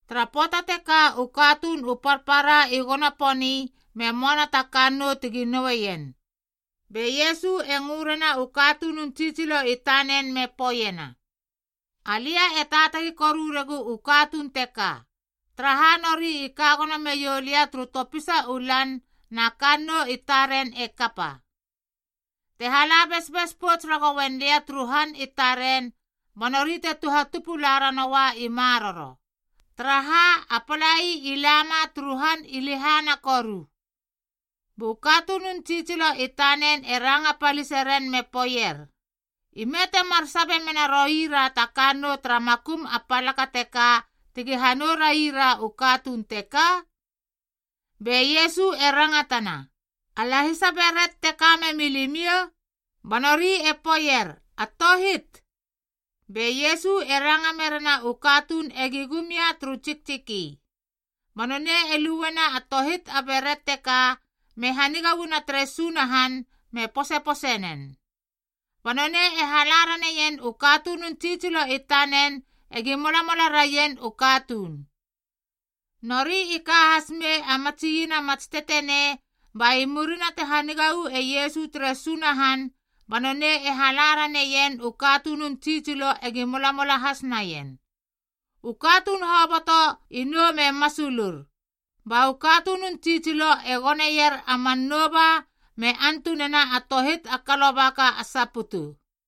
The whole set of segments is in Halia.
Tara pöata teka u katuun u parpara i gono poni me möana ta kannou tegi noueien, be Iesu e ngö rena u katunun tsitsilo i tanen me poeiena, “Alia e taatagi koru regu u katuun teka, taraha nori i ka gono meiou lia turu topisa u lan na kannou i taren e kapa. Te hala besbes pouts ragoien lia turu han i taren ba nori te tuhatupu la ranoua i maroro. Taraha, a palai i lama turu han i lehana koru.” Bu katunun tsitsilo i tanen e ranga palise ren me poeier, “Ime temar sabe mena roira ta kannou tara makum a palaka teka tegi hanou raira u katuun teka?” Be Iesu e rangatana, “A lahisa beret te ka memi limiou?” Ba nori e poeier, “A tohit.” Be Iesu e ranga merena u katuun egi gum ia turu tsiktsiki. Ba nonei e luena a tohit a beret teka me haniga uana tere Sunahan me posepose nen. Ba nonei e hala raneien u katunun tsitsilo i tanen egi molamola raien u katuun. Nori i ka has mei a matsi iena mats tetenei, ba i murina te haniga uu e Iesu tere Sunahan ba nonei e hala raneien u katunun tsitsilo egi molamola has naien. U katuun hoboto i nou me masulur. Ba u katunun tsitsilo e goneier a man nouba me antunena a tohit a kalobaka a saputu.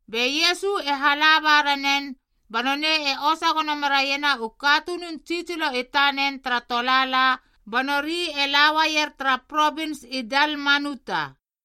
Be Iesu e hala ba ranen ba nonei e osa gono meraiena u katunun tsitsilo i tanen tara tolaala ba nori e la uaier tara provins i Dalmanuta.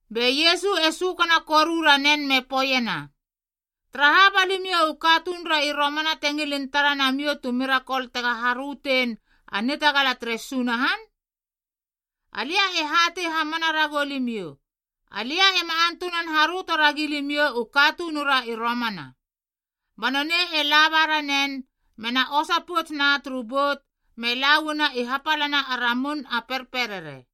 Be Iesu e sökana koru ranen me poeiena, “Taraha ba limiou u katunura i romana te ngilin tara namiou tu mirakol tega harötein, a nitagala tere Sunahan? Alia e hatei hamana ragou limiou, alia ema antunan haröto ragi limiou u katunura i romana tu mirakol.” Ba nonei e laba ranen, mena osa pouts na turu bout me la uana i hapalana a ramun a perperere.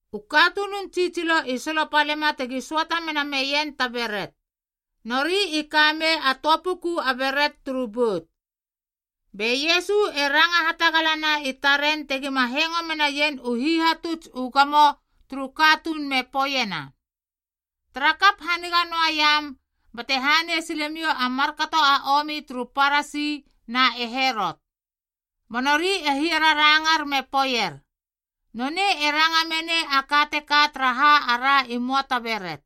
U katunun tsitsilo i solopalema tegi söata mena meien ta beret. Nori i kamei a töa puku a beret turu bout. Be Iesu e ranga hatagalana i taren tegima hengo menaien u hihatuts u gamo turu katuun me poeiena, “Tarakap haniga noaiam bate hanei silemiou u is turu Parasi na e Herot.” Ba nori e hiararangar me poeier, “Nonei e ranga menei a ka teka taraha ara i möa ta beret.”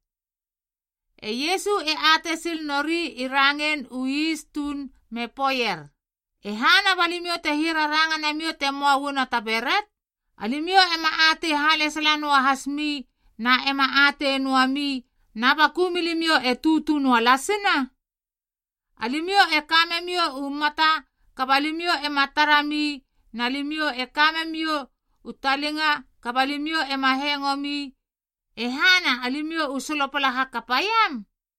E Iesu e atei sil nori i rangein u is tuun me poeier, “E hana ba limiou te hiararanga namiou te möa uana ta beret? Alimiou ema atei halesala noa hasmi na ema atei noami na baku milimiou e tutu noalasina? Alimiou e ka memiou u mata kaba limiou ema tara mi na limiou e ka memiou u talinga kaba limiou ema hengo mi, e hana alimiou u solopala hakapaiam?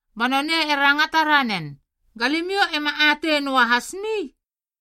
Ba nonei e rangata ranen, “Ga limiou ema atei noa hasmi?”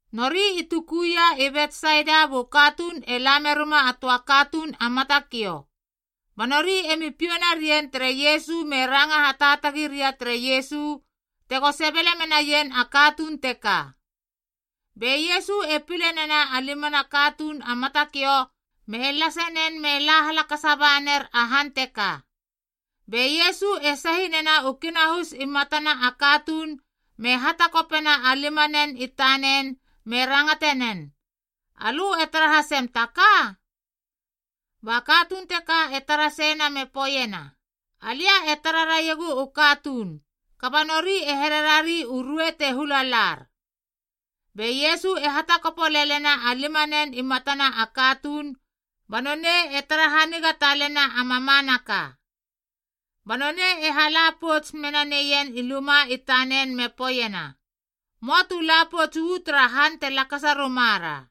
Nori i tukuia i Betsaida bu katuun e la merima a töa katuun a matakiou. Ba nori emi piou narien tere Iesu me ranga hataatagi ria tere Iesu tego sebele menaien a katuun teka. Be Iesu e pile nena a limana a katuun a matakiou me lase nen me la halakasa ba ner a han teka. Be Iesu e sahi nena u kinahus i matana a katuun me hatakopena a limanen i tanen me rangate nen, “Alö e tara hasem ta ka?” Ba katuun teka e tara seiena me poeiena, “Alia e tara raiegu u katuun, kaba nori e here rari a ruei te hula lar.” Be Iesu e hatakopo lelena a limanen i matana a katuun ba nonei e tara haniga talena a mamanaka. Ba nonei e hala pouts mena neien i luma i tanen me poeiena, “Möa tu la pouts uu tara han te lakasa ruma ra.”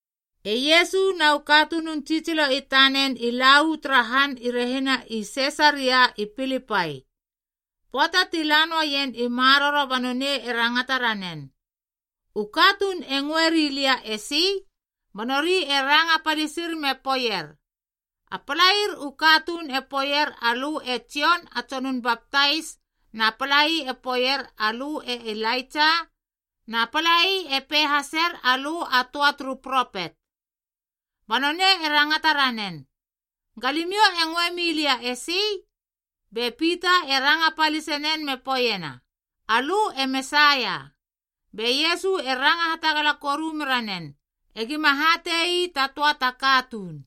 E Iesu na u katunun tsitsilo i tanen i la uu tara han i rehina i Sisaria i Pilipai. Pöata ti la noaien i maroro ba nonei e rangata ranen, “U katuun e ngöeri lia esi?” Ba nori e ranga palisir me poeier, “A palair u katuun e poeier alö e Jon a Tsonun Baptais, na palai e poeier alö e Ilaitsa, na palai e pei haser alö a töa turu propet.” Ba nonei e rangata ranen, “Ga limiou e ngöe milia esi?” Be Pita e ranga palise nen me poeiena, “Alö e Mesaia.” Be Iesu e ranga hatagala koru mera nen, egima hate ii ta töa ta katuun.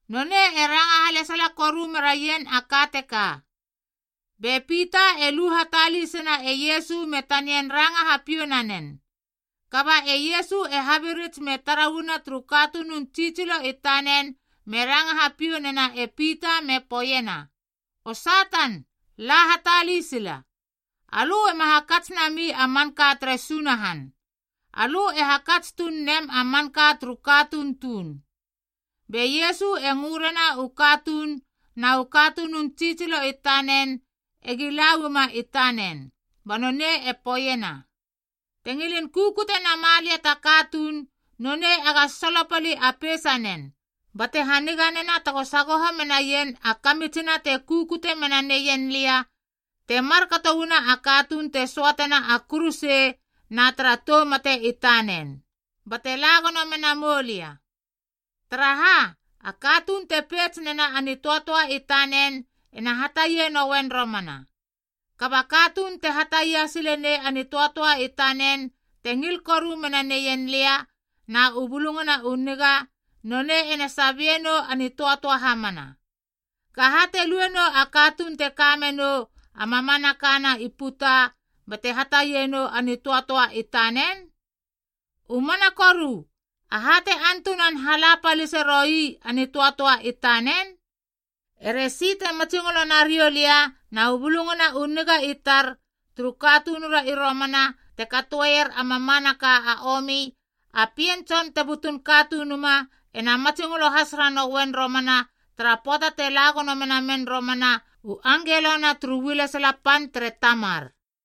Nonei e ranga halesala koru meraien a ka teka. Be Pita e lu hatalisena e Iesu me tanian ranga hapiou nanen. Kaba e Iesu e habirits me tara uana turu katunun tsitsilo i tanen me ranga hapiou nena e Pita me poeiena, “O Satan, la hatalisila. Alö ema hakats nami a manka tere Sunahan. Alö e hakats tuun nem a manka turu katuun tuun.” Be Iesu e ngö rena u katuun na u katunun tsitsilo i tanen egi la uama i tanen. Ba nonei e poeiena, “Te ngilin kukute nama lia ta katuun, nonei ega solopali a peisanen, bate haniga nena tego sagoho menaien a kamitsina te kukute mena neien lia te markato uana a katuun te söatena a kuruse na tara tou mate i tanen, bate la gono mena moulia. Taraha, a katuun te peits nena a nitöatöa i tanen ena hatia nouen romana. Kaba a katuun te hatia sile nei a nitöatöa i tanen te ngil koru mena neien lia na u Bulungana u Niga, nonei ena sabie nou a nitöatöa hamana. Gaha te lue nou a katuun te ka menou a mamanaka na i puta bate hataie nou a nitöatöa i tanen? U mana koru aha te antunan hala palise roui a nitöatöa i tanen? E resi te matsingolo nariou lia na u Bulungana u Niga i tar turu katunura i romana te katoeier a mamanaka a omi, a Pien Tson te butun Katunuma ena matsingolo has ranouen romana tara pöata te la gono menamen romana u angelona turu ualesala pan tere Tamar.”